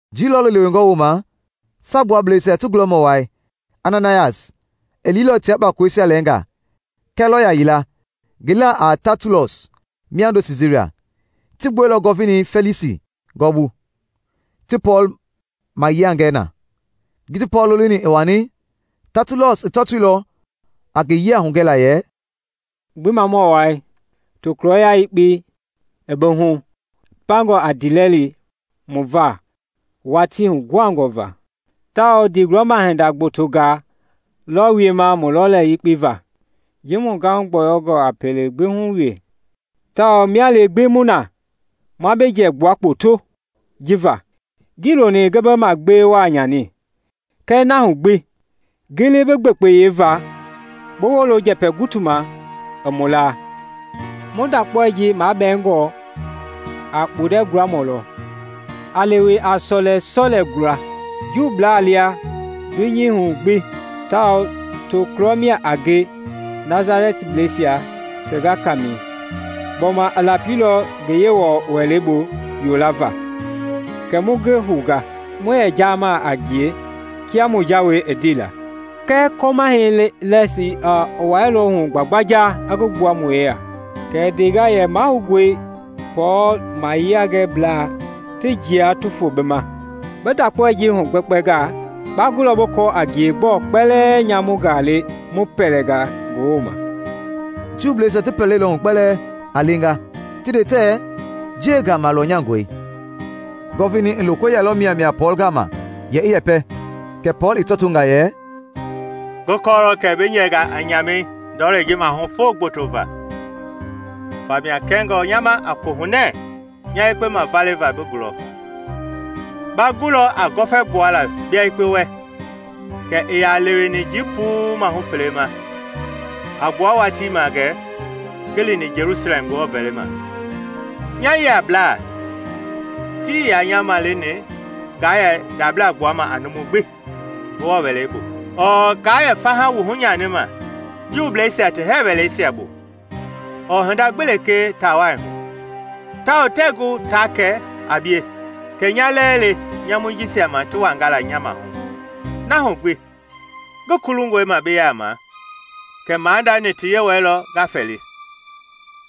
Jii lɔɔlu lewengɔ woma Saagbuablɛisia ti gulɔmɔ wai Ananayas i liilɔ tia kpakoloisia lɛnga kɛ lɔya yila ngi laa a Tatulus miando Siisaria. Ti gbueilɔ Gɔvinei Fɛlisi gɔɔbu ti Pɔɔl mayiangɛ na. Ji ti Pɔɔl lolini i wani, Taatulus i tɔɔtoilɔ a ngi yia hugɛla yɛ: “Gbimamɔ Wai! Tokulɔya yekpei i bi hu pangɔi a ndiilɛli mu va watii huguhangɔ va, tawao ndigulɔma hinda gbotongaa lɔ wiema mu lɔlei gbekpe va. Ji mu gahu gbuangɔi a pelei gbi hu wee tao mia lee gbi mu na, ma bi jiɛ gbualɔ kpoto ji va. Ngii loni ngi bi magbee wa nyani, kɛɛ na hu gbi, gili bi gbekpeyei va bi wolo njɛpɛ gutu ma i mu laa. Mu ndakpaoi ji mabɛɛngɔ a kpundɛ gulamɔ lɔ, a lewe a sɔleisia gula Juublaa lia dunyei hu gbi, tawao tokulɔ mia a ngie Nasaleinbleisia ti gakamɛi. Gbɔma i lapilɔ gɛ Ngewɔ wɛleibu yolava, kɛ mu ngi hounga. [Mu yɛ gɛ jiamaa a ngie kia mu jawei ndeila, kɛɛ kɔmahɛi Lisias i wuailɔ hu gbagbanja i ngi gbua mu yeya. Kɛ i ndenga yɛ mahoungɔe Pɔɔl mayiangɛiblaa ti njia ti fo bi ma.] Bi ndakpaoi ji hugbɛkpɛngaa, ba gulɔ bi kɔɔ a ngie gbɔɔ kpɛlɛɛ nyamungaa le mu pɛlɛnga ngi woma.” Juuisia ti pɛlei lɔ hu kpɛlɛɛ a lenga ti nde tɛɛ njiɛi gama lɔnyangɔi. Gɔvinei i loko yɛlɔ miamia Pɔɔl gama yɛ i yɛpɛ; kɛ Pɔɔl i tɔtonga yɛ: “Ngi kɔɔlɔ kɛ bi yɛnga a nyamei ndɔlei ji maahu foo gboto va, famia kɛngɔ nya ma a kohunɛ nya yekpe mavale va bi gulɔ. Ba gulɔ a gɔfɛ gbuala bia yekpe wɛ kɛ ii yaa leweni jii puu mahu fele ma a gbua watii ma gɛ ngi lini Jelusalɛm Ngewɔ vɛlima. Nya yiablaa tii nya maleni nga yɛ ndabla gbuama a numu gbi Ngewɔ wɛleibu ɔɔ ngaa yɛ faha wuhu nyani ma Juuisia ti hɛɛ wɛleisiabu ɔɔ hinda gbi lekee taawai hu. Tawao tɛɛ gu ta kɛ a bie kɛ nya lɛɛ le nyamui jisia ma ti wangala nya maahu. Na hu gbi, ngi kulungɔi ma bi yaama kɛ maadani ti Yewɔɛi lɔ nga fɛli,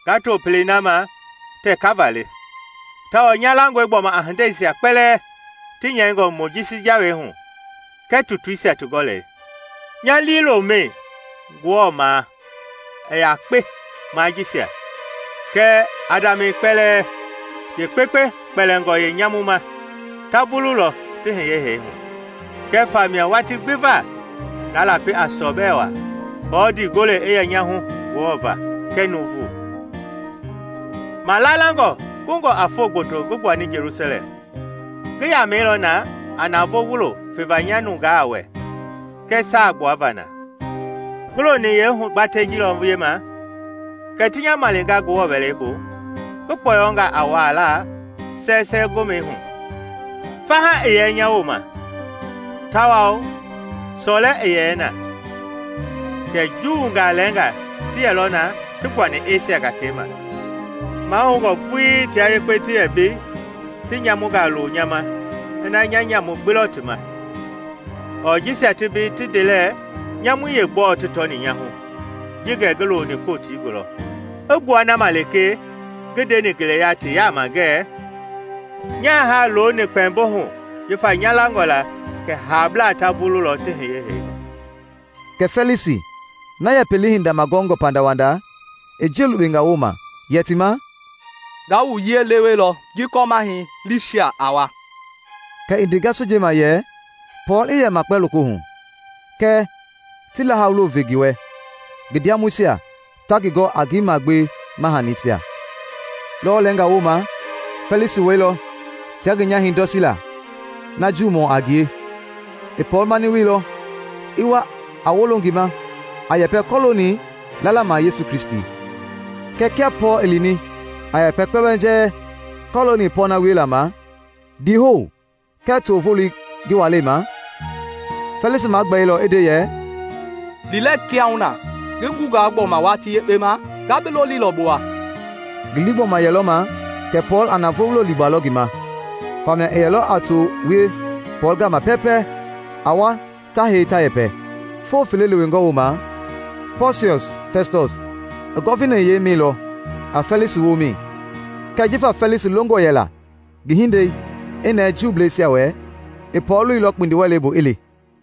nga to Pelei na ma tɛ kava le. Tawao nya langɔe gbɔma a hindeisia kpɛlɛɛ ti nyɛingɔ Mojisi Jawei hu kɛɛ tutuisia ti gɔlɛi. Nya liilomɛi Ngewɔ ma i yakpe ma jisia, kɛ Adamɛi kpɛlɛɛ, yeekpekpe kpɛlingɔ yeenyamu ma, ta vululɔ ti hiye hee hu. Kɛ famia watii gbi va nga lapi a sɔbɛ wa aako ndii gole i yɛ nya hu Ngewɔ va kɛɛ nuuvu.” “Malalangɔ kungɔ a foo gboto ngi gbuani Jelusalɛm, ngi yamɛilɔ na a navoo wulo feva nya nungaa wɛ kɛɛ saa kpuava na. Ngi loni yeehugbatɛi jilɔ wiema kɛ ti nya malinga Ngewɔ wɛleibu ngi kpɔyɔnga a wuaala sɛsɛɛ gomɛi hu. Faha ii yɛ nya woma, tawao sɔlɛ ii yɛ na. Kɛɛ Juungaa lɛnga ti yɛlɔ na ti gbuani Esia gakei ma; mahoungɔ vuii tia yekpe ti yɛ mbei ti nyamungaa loo nya ma ina nya nyamu gbi lɔ ti ma. Ɔɔ jisia ti mbei ti ndelɛ nyamui yeegbɔɔ ti tɔni nya hu ji gɛ ngi looni kotii gulɔ i gbua na ma lekee ngi ndeni ngeleya ti yaama ngɛ: Nya haa looni kpɛmbo hu jifa nya langɔ la kɛ haablaa ta vululɔ ti hiye hee hu.” Kɛ Fɛlisi, na yɛ Pelei hinda magɔngɔ pandawanda i njiɛ lukpenga woma yɛ ti ma, “Nga wu yiɛi lewelɔ ji kɔmahɛi Liisias a wa.” Kɛ i ndenga sojei ma yɛ Pɔɔl i yɛ makpa lokohu kɛɛ ti laha wulo ve ngi wɛ ngi ndiamɔisia ta ngi gɔ a ngi magbewe ma hanisia. Lɔwɔ lɛnga woma Fɛlisi wɛilɔ tia ngi nyahɛi Dɔsila, na Juumɔ a ngie. I Pɔɔl mani wielɔ i wa a wolo ngi ma a yɛpɛ kɔlooni lala ma Yesu Kristi. Kɛɛ kia Pɔɔl i lini a yɛpɛ kpɛmbɛnjɛɛ kɔlooni pɔɔna wiela ma, ndiihou kɛɛ too voloi ngi walei ma, Fɛlisi magbɛilɔ i nde yɛ, “Li lɛ kiahuna. Ngi gungaa gbɔma watii yekpe ma, nga bi lolilɔ bi wa.” Ngi lii gbɔma yɛlɔ ma kɛ Pɔɔl a navoo wulo liigbalɔ ngi ma, famia i yɛlɔ a too wie Pɔɔl gama pɛpɛɛ a wa ta hei ta yɛpɛ. Foo fele lewengɔ woma, Pɔsiɔs Fɛstɔs i Gɔvinayei mɛilɔ a Fɛlisi womɛi; kɛɛ jifa Fɛlisi longɔ yɛla ngi hinde i nɛɛ Juubleisia wɛ, i Pɔɔl loilɔ kpindiwɛleibu i li.